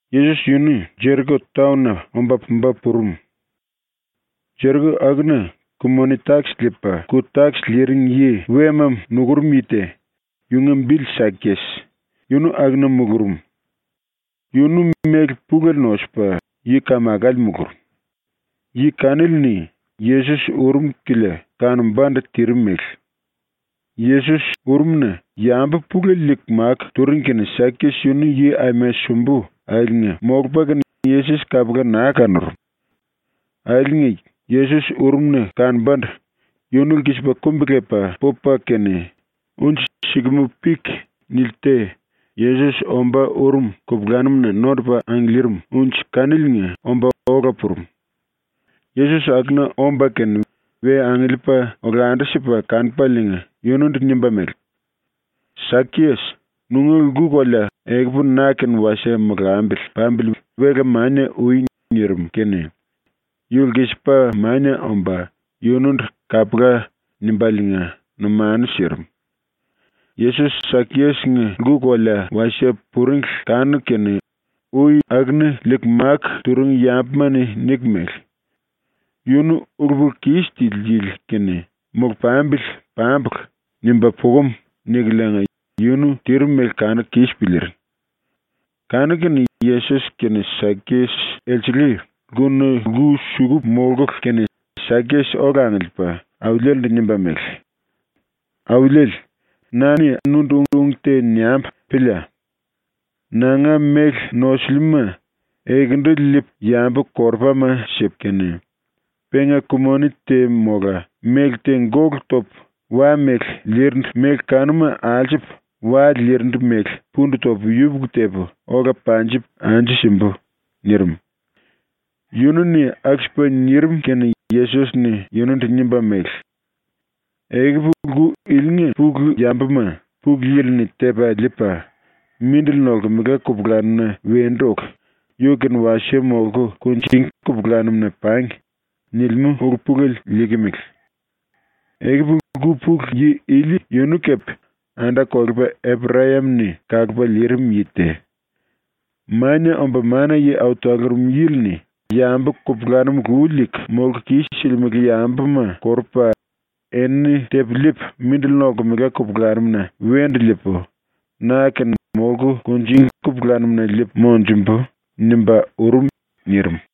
Yesos yunu Jeriko taon-na omba pumba purum. ⸤Jeriko akuna⸥ ku-moni-takis liipa ku-takis liiring yi wema nukurum yi te, yunga bili Sakias, yunu akuna mulurum. Yunu méle pulele nosupa yi-kamakale mulurum. Yi kanili-ni Yesos urum kilia kanombandu tirim mele. Yesos urumna yambu pulele liiku máku turing kene Sakias yunu yi aima sumbu akiliinga molupa kene Yesos kapula naa kanurum. Akiliinga Yesos urumna kanombandu yunu lkisipa kumbi-lepa pupa kene unji sikamú-pik nili te Yesos ombá urum kupulanum-na nondupa angiliirim unji kaniliinga omba ola purum. Yesos akuna omba kene we angiliipa olandu-sipa kanupaliinga yunundu nimba mele: “Sakias, nunga lku-kolea ekupu na-kene wasie molambili pambili wela mania ui.” nirim kene yu lkisipa mania omba yunundu “Kapula.” nimbaliinga numanu sirim. Yesos Sakias-nga lku-kolea wasie puringli kanuku kene ui akuna liiku máku turing yambuma-ni niku mele: “Yunu ulu-pulu-kis tili yili kene ‘Molu-pambili pambulu.’ nimba pukum.” nikuliinga yunu tirim mele kanuku kis piliiring. Kanu-kene Yesos kene Sakias elsele lkuna lku-suku molkulu kene Sakias ola angiliipa Auliele-ndu nimba mele: “Auliele, na-ni nundu ung te niambu pília. Nanga méle nosiliuma ekendu liipu yambu-korupama sipu kene, penga ku-moni te mola méle te gólu topu wa-mele liirindu méle kanuma alsupu wa liirindu mele pundu topu yupuku tepu ola panjipu anju simbu.” nirim. Yunu-ni aku-sipa nirim kene Yesos-ni yunundu nimba mele: “Ekupu lku ilinga pulu yambuma Pulu Yili-ni tepa liipa ‘mindili nolkemela kupulanum-na wendu oku, yu-kene wasie molku kunjingí kupulanum-na pangi.’ nilimú ulu-pulele liikimele. Ekupu lku pulu yi ili yunu kepe anda-kolepa Eprayam-ni kalupa liirim yi te. “Mania Omba Mana-Yi Au Talurum Yili-ni ‘Yambu kupulanum lu liiku molku kis-silimele yambuma korupu, enini tepu liipu mindili nolkemela kupulanum-na wendu liipu na-kene molku kunjingí kupulanum-na liipu monjumbu.’ nimba urum.” nirim.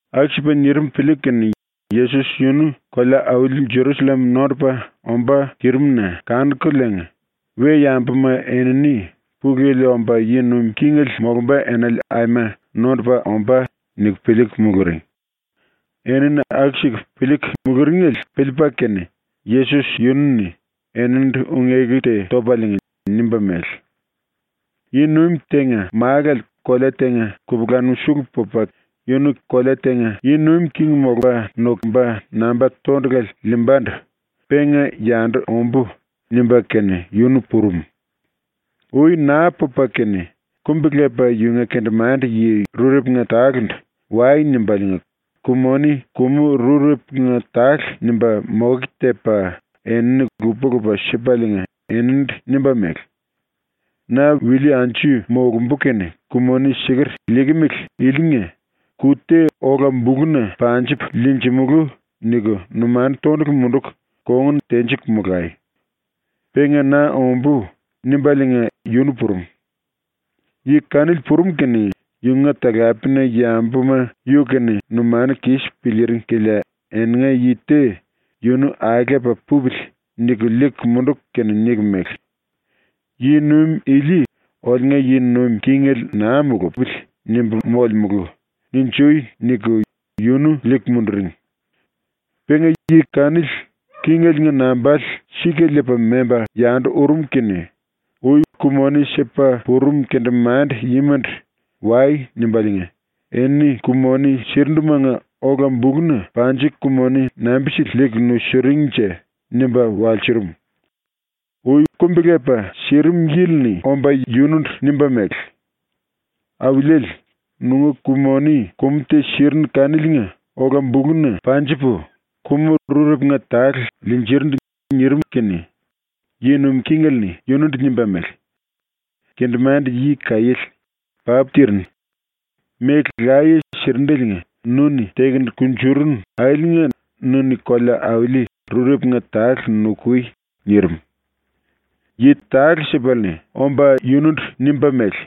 Aku-sipa nirim piliiku kene Yesos yunu kolea-auli Jerusallem nondupa ombá tirim-na kanukuliinga we-yambuma enini ‘Pulu Yili omba yi nuim kingele molumba enale aima nondupa ombá.’ niku piliiku muluring. Enini aku-siku piliiku muluringele piliipa kene ⸤Yesos⸥ yunu-ni eninindu ung-eku te topaliinga nimba mele: “Yi-nuim tenga málale kolea tenga kupulanum sulu pupa kene yunu king molumba namba tondulale liimbandu ‘Penga yandu ombú.’ nimba kene yunu purum. Ui naa pupa kene kumbi-lepa yunga kendemande-yi rurepunga tale-ndu “Wai.” nimbaliinga ku-moni kumu rurepunga tale nimba moke tepa enini lupa-lupa sipaliinga eninindu nimba mele: “Na wilí anju molumbu kene ku-moni siker liikimele ilinga ‘Ku te ola-buluna panjupu liinjimulú.’ niku numanu tondulu munduku kongun tenjiku molai. Penga na ombú.” nimbaliinga yunu purum. Yi kanili purum kene yunga talapena-yambuma yu-kene numanu kis piliiring kilia eninga yi te ‘Yunu aelepa pupili.’ niku liiku munduku kene niku mele: “‘ “Yi-nuim ili oliunga yi nuim kingele naa mulupili.” nimbu molemulu.’ ninjui.” niku yunu liiku munduring. Penga yi kanili kingeliinga nambale sika liipa memba yandu urum kene ui ku-moni sipa purum kendemande-yimandu “Wai.” nimbaliinga “Eni ku-moni sirindumanga ola-buluna panjiku ku-moni nambi-sili liiku nusunjuring-nje?” nimba walsurum. Ui kumbi-lepa sirim yili-ni omba yunundu nimba mele: “Auliele, nunga ku-moni kumu te sirinu kaniliinga ola-buluna panjipu kumu rurepunga tale liinjirindu.” nirim kene yi nuim kingele-ni yunundu nimba mele: “Kendemande-yi kaiéle. Papu tirinu. Méle laye sirindeliinga nu-ni tekunu kunjurunu akiliinga nu-ni kolea-auli rurepunga tale nukui.” nirim. Yi tale-sipale-ni omba yunundu nimba mele: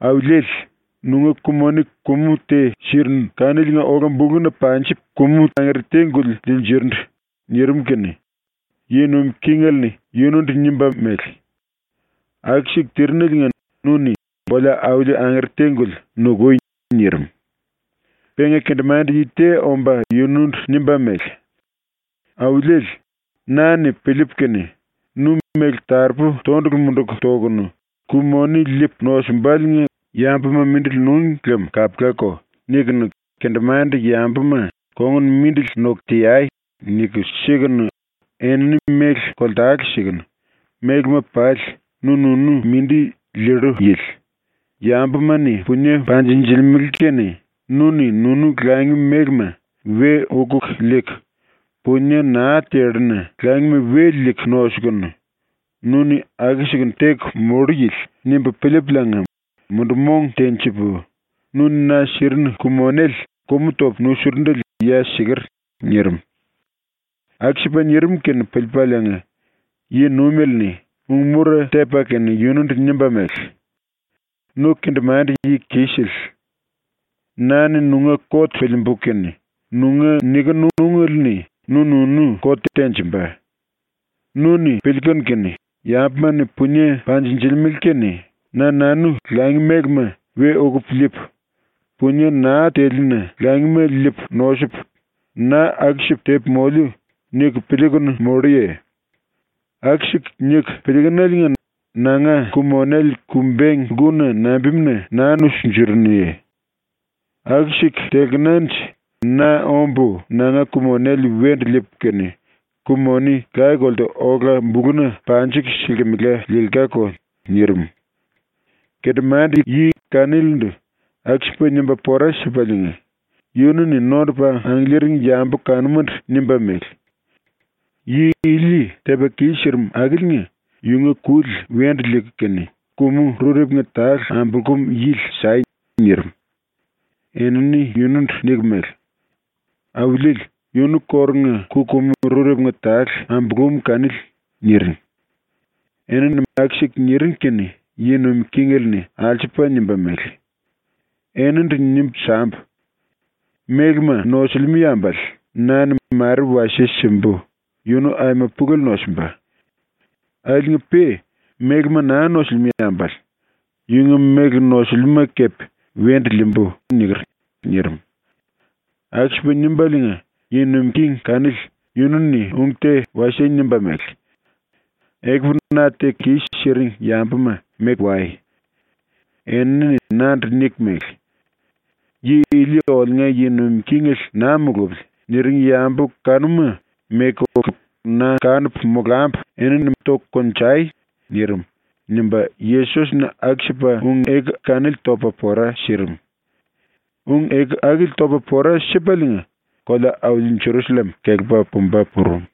“Auliele, nunga ku-moni kumu te sirinu kaniliinga ola-buluna panjipu kumu angere te-guli liinjirindu.” nirim kene yi nuim kingele-ni yunundu nimba mele: “Aku-siku tirineliinga nu-ni kolea-auli angere te-guli nukui.” nirim. Penga kendemande-yi te omba yunundu nimba mele: “Auliele, na-ni piliipu kene ‘Nu méle taropu tondulu munduku tokunu, ‘Ku-moni liipu nosumbaliinga yambuma mindili núngi lem kapulako.’ nikunu ⸤kendemande-yambuma ‘Kongun mindili noku teai.’ niku sikunu, enini méle koltale sikunu mélema pali nu-nunu mindi liillu yili;⸥ yambuma-ni punie panjinjilimele kene nu-ni nunu langi mélema we ukuku liiku; punie naa telluna langima we liiku nosukunu, nu-ni aku-sikunu teku mollu yili.’ nimbu piliipuliinga mundu-mong tenjipu nu-ni na sirinu ku-monele kumu topu nusurundele ya siker.” nirim. Aku-sipa nirim kene piliipaliinga yi-nuimele-ni ung-mura tepa kene yunundu nimba mele: “Nu kendemande-yi kisele. ⸤Na-ni nunga kot piliimbu kene⸥ nunga nikinu ungele-ni nu-nunu kot tenjimba. Nu-ni piliikunu kene ‘Yambuma-ni punie panjinjilimele kene na-nanu langi mélema we ukupu liipu; punie naa teliuna langima liipu nosupu, na aku-sipu tepu moliu.’ niku piliikunu molluye? Aku-siku niku piliikunuliinga nanga ku-monele ku-beng lkuna nambimuna naa nusunjurunuye? Aku-siku telkenanje na ombu nanga ku-monele wendu liipu kene ku-moni laye-kolte ola-buluna panjiku silkimela liilkáko.” nirim. ⸤Kendemande-yi kanilindu aku-sipa nimba pora sipaliinga⸥ yunu-ni nondupa angiliiring yambu kanumandu nimba mele: “Yi ili tepa kis-sirim akiliinga yunga kuli wendu liiku kene ku-kumu rurepunga tale ambulkum yili sai.” nirim. Enini yunundu niku mele: “Auliele, yunu kórunga ku-kumu rurepunga tale ambulúm kanili.” niring. Enini aku-siku niring kene yi nuim kingele-ni alsupa nimba mele: “Enindu nimbu sambu: “Mélema nosilimú yambale na-ni mare wasie simbu, yunu aima pulele nosimba. Akiliinga-pe mélema naa nosilimú yambale yunga méle nosulimúma kepe wendu liimbu.” niker.” nirim. Aku-sipa nimbaliinga yi nuim king kanili yunu-ni ung te wasie nimba mele: “Ekupu na teku kis-siring yambuma meku wai. Enini nandu niku mele: ‘Yi ili oliunga yi nuim kingele naa mulupili.’ niring yambu kanuma meku oku na kanupu molambu enini toku konjai.” nirim.” nimba ⸤Yesos-ni aku-sipa ung-eku kanili topa pora sirim⸥. Ung-eku akili topa pora sipaliinga kolea-auli Jerusallem kelepa pumba purum.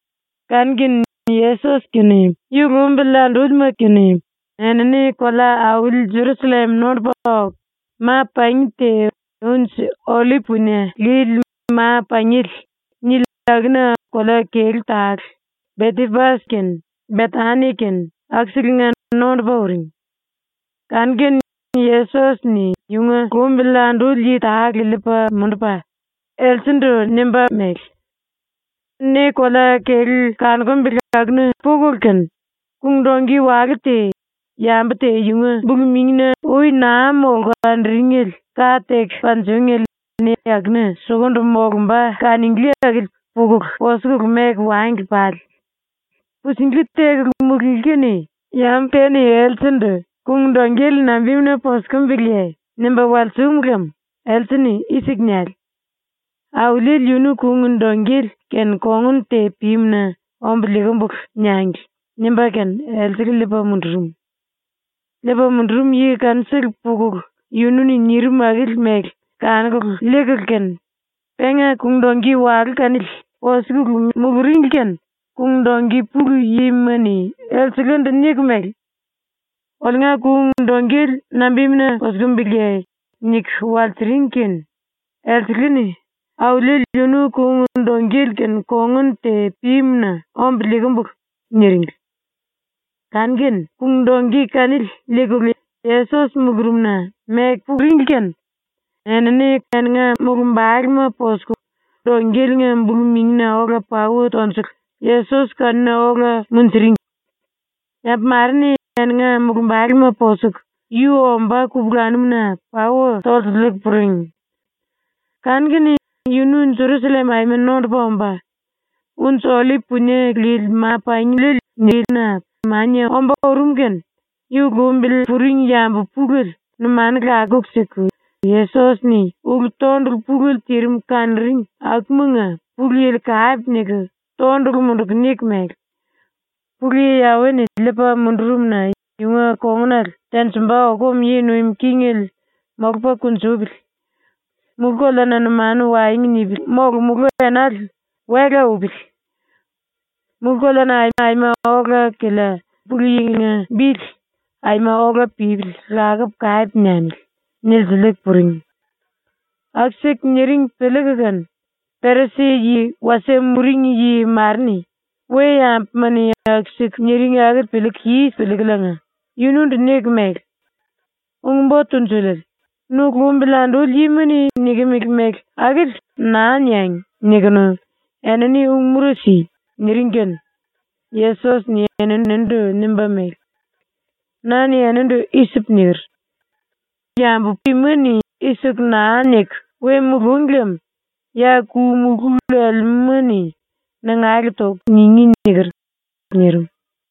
Kanu-kene Yesos ⸤kene yu lumbili andúlima kene enini kolea-auli Jerusallem nondupa oku⸥, ma-pangi te ‘Unji-Ollip Punie Lili Ma-Pangiele’ nili akuna kolea kelú tale, Betepas kene Betani kene akuselenga nondupa uring. Kanu-kene Yesos-ni yunga lumbili anduli yi tale liipa mundupa, elselendu nimba mele: “Ne kolea-kelú kanukumbele akuna pukulu kene kung-dongki walú te, yambu te yunga bulu-mingina ui naa molku anduringele ka teku panjingéle ne akuna sukundu molumba kanunglí akili pukulu posukulu meku wangli pale. Pusinglí tekulu mulunglí kene yambu te-ni elsendu “Kung-dongkele nambimuna posukimbiliye?” nimba walsum lem else-ni i-siku niale: “Auliele yunu kung-dongkele-kene kongun te pímu-na ombu liikimbulu.” niangli.” nimba kene elsele liipa mundurum. Liipa mundurum yi kanusele pukulu yunu-ni nirim akili mele kanuku liikulu kene penga kung-dongki walú kanili posikulu muluringli kene kung-dongki pulu yima-ni elselendu niku mele: “Oliunga kung-dongkele nambimuna posukimbiliye?” niku walsiring kene elsele-ni “Auliele yunu kung-dongkele-kene kongun te pímu-na ombu liikimbulu.” niringli. Kanu-kene kung-dongki kanili liikulu Yesos mulurumna meku pukulu kene elsengla mulumbalema posukulu, dongkeliinga bulu-mingina ola pauwa tonjukulu Yesos kanuna ola munjuringli. Yambu mare-ni eninga mulumbalema posuku yu ombá kupulanum-na pauwa tolsiliiku puring. Kanu-kene yunu Jerusallem aima nondupa omba, Unji-Ollip Punie Lili Ma-Pangina mania ombá urum kene yu lumbili puring yambu pulele numanu lakuku siku ⸤Yesos-ni⸥ ulu-tondulu pulele tirim kanuring akumanga Pulu Yili kape niku tondulu munduku niku mele: “Pulu Yi Yawe-ni liipa mundurum-na yunga kongunale tenjimba okum yi nuim kingele molupa kunjupili. Mulú-koleana numanu waengu nipili molomulú enale wela upili. Mulú-koleana aima ola-kilia ⸤Pulu Yili-nga⸥ bili aima ola pípili lakupu kape niamili.” nilsiliiku puring. Aku-siku niring piliiku kene Perisi-yi wasie puring yi mare-ni ⸤we-yambuma-ni aku-siku niring akili piliiku kis piliikuliinga⸥ yunundu niku mele: “Ung-Bo Tunjuliele, nu lumbili anduli yima-ni nikimili mele akili ‘Naa niangi.’ nikunu enini ung-mura si.” niring kene Yesos-ni eninindu nimba mele: “Na-ni enindu i-sipu niker: “Yambu ima-ni i-siku naa niku we mulúngi lem ya ku-mulú lelemúma-ni nangale toku ningí.” niker.” nirim.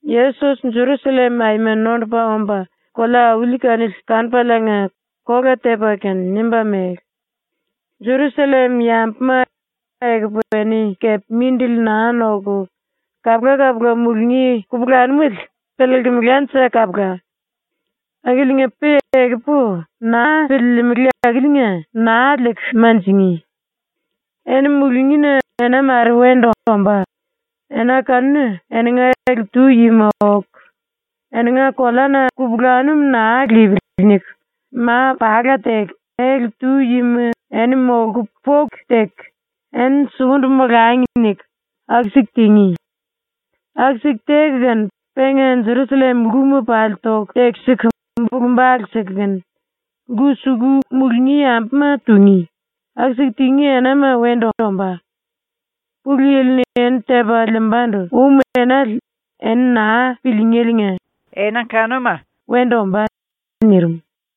Yesos Jerusallem aima nondupa omba kolea-auli kanili kanupaliinga kola tepa kene nimba mele: “⸤Jerusallem yambuma,⸥ ekupu eni kepe mindili naa noku kapula-kapula mulungí kupulanumele piliilkimilánje kapula. Akiliinga-pe ekupu naa piliilimili ⸤akiliinga⸥ naa liiku manjingí. Eni mulungína ena mare wendu ombá, ena kanuna eninga ele-tu yima oku ‘Eninga koleana kupulanum naa lipili.’ niku ma-pala teku ele-tu yima eni molku poku teku ‘Eni sukundu molangi.’ niku aku-siku tingí. Aku-siku teku kene, penga Jerusallem lkuma pali toku tekisiku bulu-bale siku kene lku-suku mulungí yambuma tungí, aku-siku tingí enama wendu ombá. Pulu Yili-ni ⸤eni tepa liimbandu⸥ um enale eni naa pilííngeliinga ena kanuma wendu ombá.” nirim.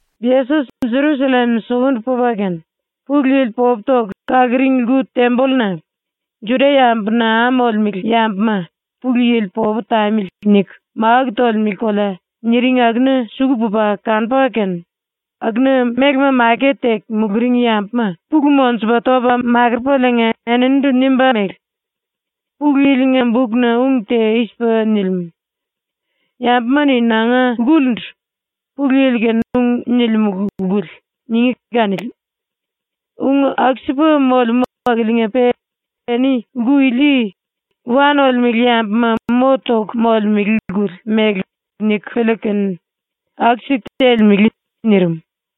Yesos ⸤Jerusallem sukundu pupa kene,⸥ Pulu Yili popu toku kaluring lku-tembolluna ⸤“Juda-yambu naa molemele yambuma ‘Pulu Yili popu tamili.’ niku máku tolemele kolea” niring akuna⸥ suku pupa kanupa kene akuna mélema maket teku muluring yambuma pulu monjupa topa makurupaliinga eninindu nimba mele: “Pulu Yili-nga bukna ung te i-sipa nilimú: ‘Yambuma-ni nanga lkulindu “Pulu Yili kene ung nilimulu lkuli.” ningí.’ kanili. Ung aku-sipa molemú akiliinga-pe eni lku ili ‘wa nolemele yambuma mo toku molemele lkuli’ mele niku piliiku kene aku-siku telemele.” nirim.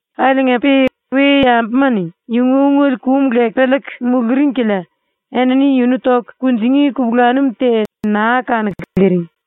akiliinga-pe we-yambuma-ni yunga ungele kum leku piliiku muluring kilia enini yunu toku kunjingí kupulanum te naa kanuku liiring.